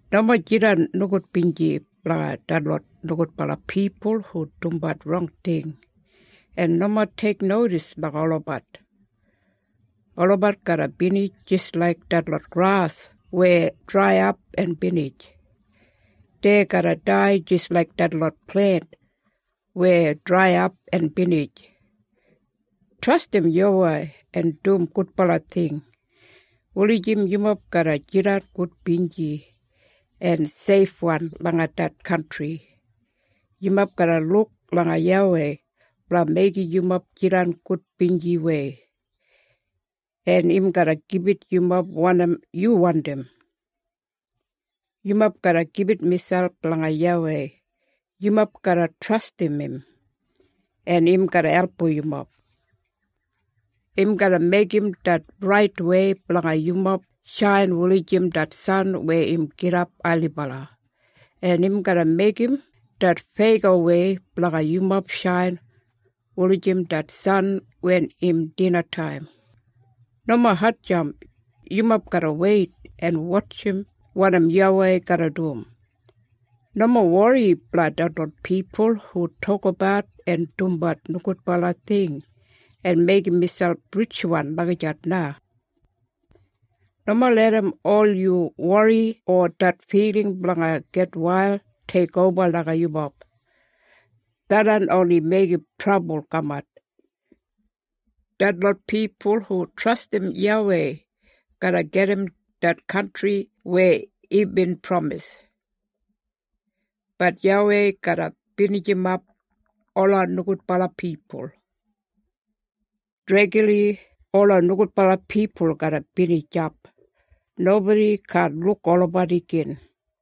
Nomo jidan nogudbinji blanga detlot nogudbala pipul hu dumbat rong ting, en nomo teiknodis langa olabat. Olabat garra binij jis laik detlot gras weya draiyap en binij. Dei garra dai jis laik detlot plent weya draiyap en binij. Trastim YAWEI en dum gudbala ting, wulijim yumob garra jidan gudbinji en seifwan langa det kantri. Yumob garra luk langa YAWEI blanga meigim yumob jidan gudbinjiwei, en im garra gibit yumob wanim yu wandim. Yumob garra gibit miselp langa YAWEI. Yumob garra trastim im en im garra album yumob. Im garra meigim det raitwei blanga yumob shain wulijim det san wen im gidap ailibala, en im garra meigim det feyagowei blanga yumob shain wulijim det san wen im dinataim. Nomo hatjamp. Yumob garra weit en wotjim wanim YAWEI garra dum. Nomo wori blanga detlot pipul hu tokabat en dumbat nogudbala ting en meigim miselp ritjwan lagijat na. Nomo larram ol yu wori o det filing blanga gitwail teikoba langa yumob. Tharran oni meigim trabul kamat. Detlot pipul hu trastim YAWEI garra gedim det kantri weya imbin pramis, bat YAWEI garra binijimap ola nogudbala pipul. Dregli ola nogudbala pipul garra binijap. Nobodi kaan luk olabat igin.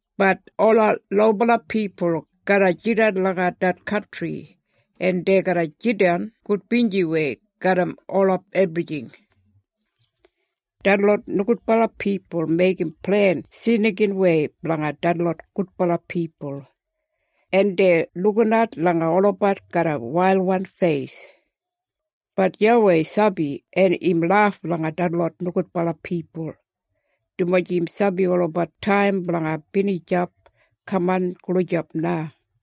Bat ola lobala pipul garra jidan langa det kantri, en dei garra jidan gudbinjiwei garram ola ebrijing. Detlot nogudbala pipul meigim plen snikinwei blanga detlot gudbala pipul, en dei lukinat langa olabat garram wailwan feis. Bat YAWEI sabi en im laf langa detlot nogudbala pipul, dumaji im sabi olabat taim blanga binijap kaman gulijap na.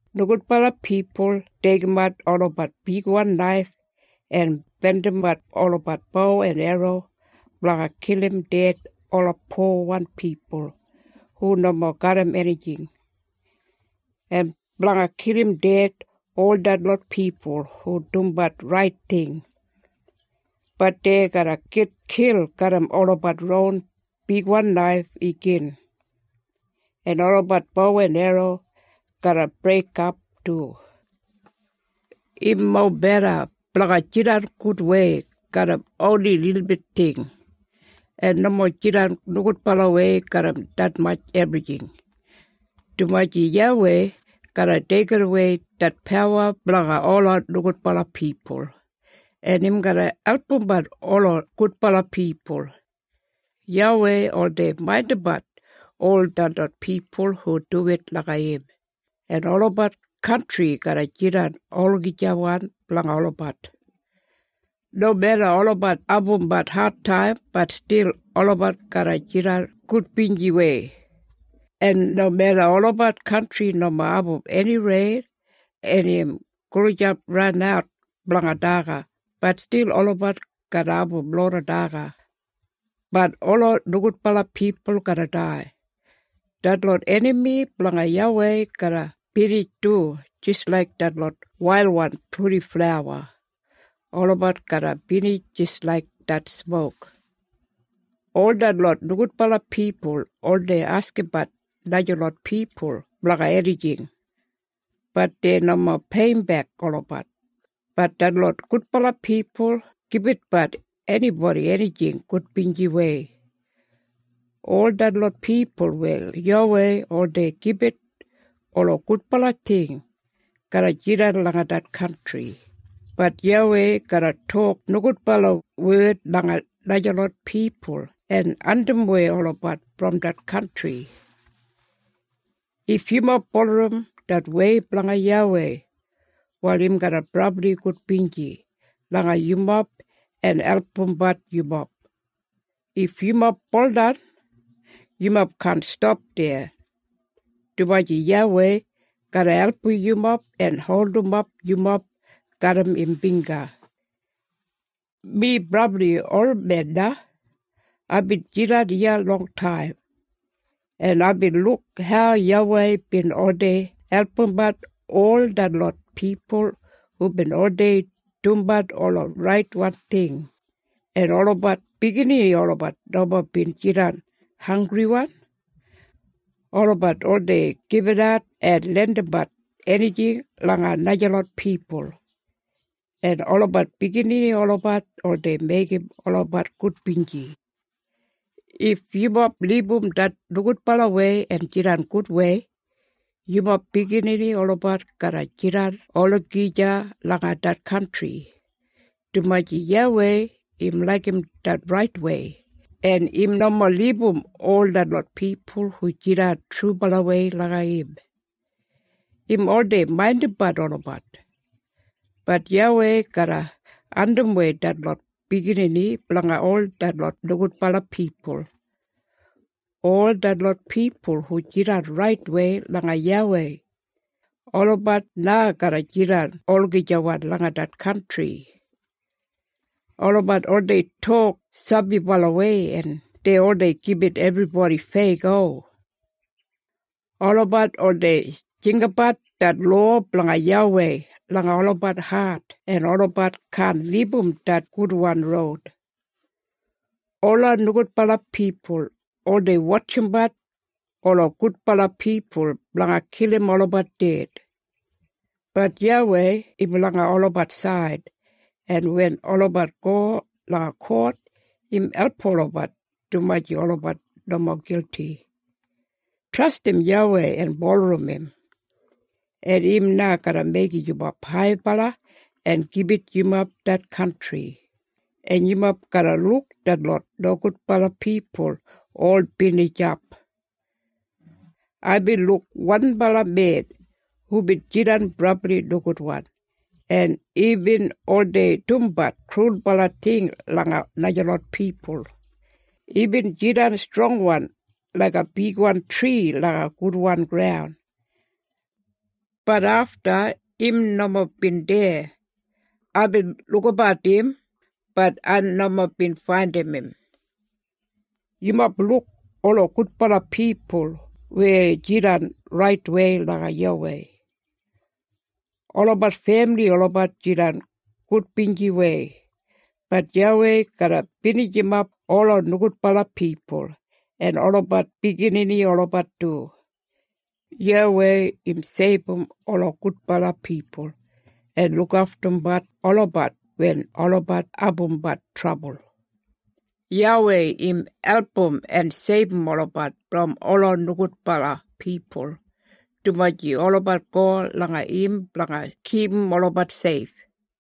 Nogudbala pipul deigimat olabat bigwan naif en bendimbat olabat bo en erro blanga kilim ded ola powan pipul hu nomo garram enijing, en blanga kilim ded ol detlot pipul hu dumbat rait ting. Bat dei garra gitkil garram olabat ron bigwan naif igin, en olabat bo en erro garra breikap du. Im mobeda blanga jidan gudwei garram oni lilbit ting, en nomo jidan nogudbalawei garram detmatj ebrijing, dumaji YAWEI garra deigidawei det pawa blanga ola nogudbala pipul, en im garra albumbat ola gudbala pipul. YAWEI oldei maindimbat ol detlot pipul hu duwit langa im, en olabat kantri garra jidan olagijawan blanga olabat. Nomeda olabat abumbat adtaim, bat stil olabat garra jidan gudbinjiwei, en nomeda olabat kantri nomo abum eni rein, en im gulijap ranat blanga daga, bat stil olabat garra abum loda daga. Bat ola nogudbala pipul garra dai. Detlot enami blanga YAWEI garra binij du, jis laik detlot wailwan purdiflawa. Olabat garra binij jis laik det smok. Ol detlot nogudbala pipul oldei askimbat najalot pipul blanga enijing, bat dei nomo peiyimbek olabat, bat detlot gudbala pipul gibitbat enibodi enijing gudbinjiwei. Ol detlot pipul weya YAWEI oldei gibit ola gudbala ting garra jidan langa det kantri, bat YAWEI garra tok nogudbala wed langa najalot pipul en andimwei olabat brom det kantri. If yumob bulurrum det wei blanga YAWEI, wal im garra brabli gudbinji langa yumob en albumbat yumob. If yumob buldan yumob kaan stap deya, dumaji YAWEI garra album yumob en holdimap yumob garram im bingga. Mi brabli olmen na. Aibin jidan iya longtaim, en aibin luk hau YAWEI bin oldei albumbat ol detlot pipul hubin oldei dumbat ola raitwan ting, en olabat biginini olabat nomo bin jidan hanggriwan. Olabat oldei gibitat en lendimbat enijing langa najalot pipul, en olabat biginini olabat oldei meigim olabat gudbinji. If yumob libum det nogudbalawei en jidan gudwei, yumob biginini olabat garra jidan olagija langa det kantri, dumaji YAWEI im laigim det raitwei, en im nomo libum ol detlot pipul hu jidan trubalawei langa im. Im oldei maindimbat olabat, bat YAWEI garra andimwei detlot biginini blanga ol detlot nogudbala pipul. Ol detlot pipul hu jidan raitwei langa YAWEI, olabat na garra jidan olagijawan langa det kantri. Olabat oldei tok sabibalawei en dei oldei gibit ebribodi feyago. Olabat oldei jinggabat det lowa blanga YAWEI langa olabat hat, en olabat kaan libum det gudwan roud. Ola nogudbala pipul oldei wotjimbat ola gudbala pipul blanga kilim olabat ded, bat YAWEI im langa olabat said, en wen olabat go langa kot im album olabat, dumaji olabat nomo gilti. Trastim YAWEI en bulurrum im, en im na garra meigim yumob haibala en gibit yumob det kantri, en yumob garra luk detlot nogudbala pipul ol binijap. Aibin luk wanbala men hubin jidan brabli nogudwan, en imbin oldei dumbat krulbala ting langa najalot pipul. Imbin jidan strongwan laiga bigwan tri langa gudwan graun. Bat afta im nomo bin deya. Aibin lukabat im bat ai nomo bin faindim im. Yumob luk ola gudbala pipul weya jidan raitwei langa YAWEI. Olabat femili olabat jidan gudbinjiwei, bat YAWEI garra binijimap ola nogudbala pipul, en olabat biginini olabat du. YAWEI im seibum ola gudbala pipul, en lukaftumbat olabat wen olabat abumbat trabul. YAWEI im album en seibum olabat brom ola nogudbala pipul, dumaji olabat go langa im blanga kipum olabat seif.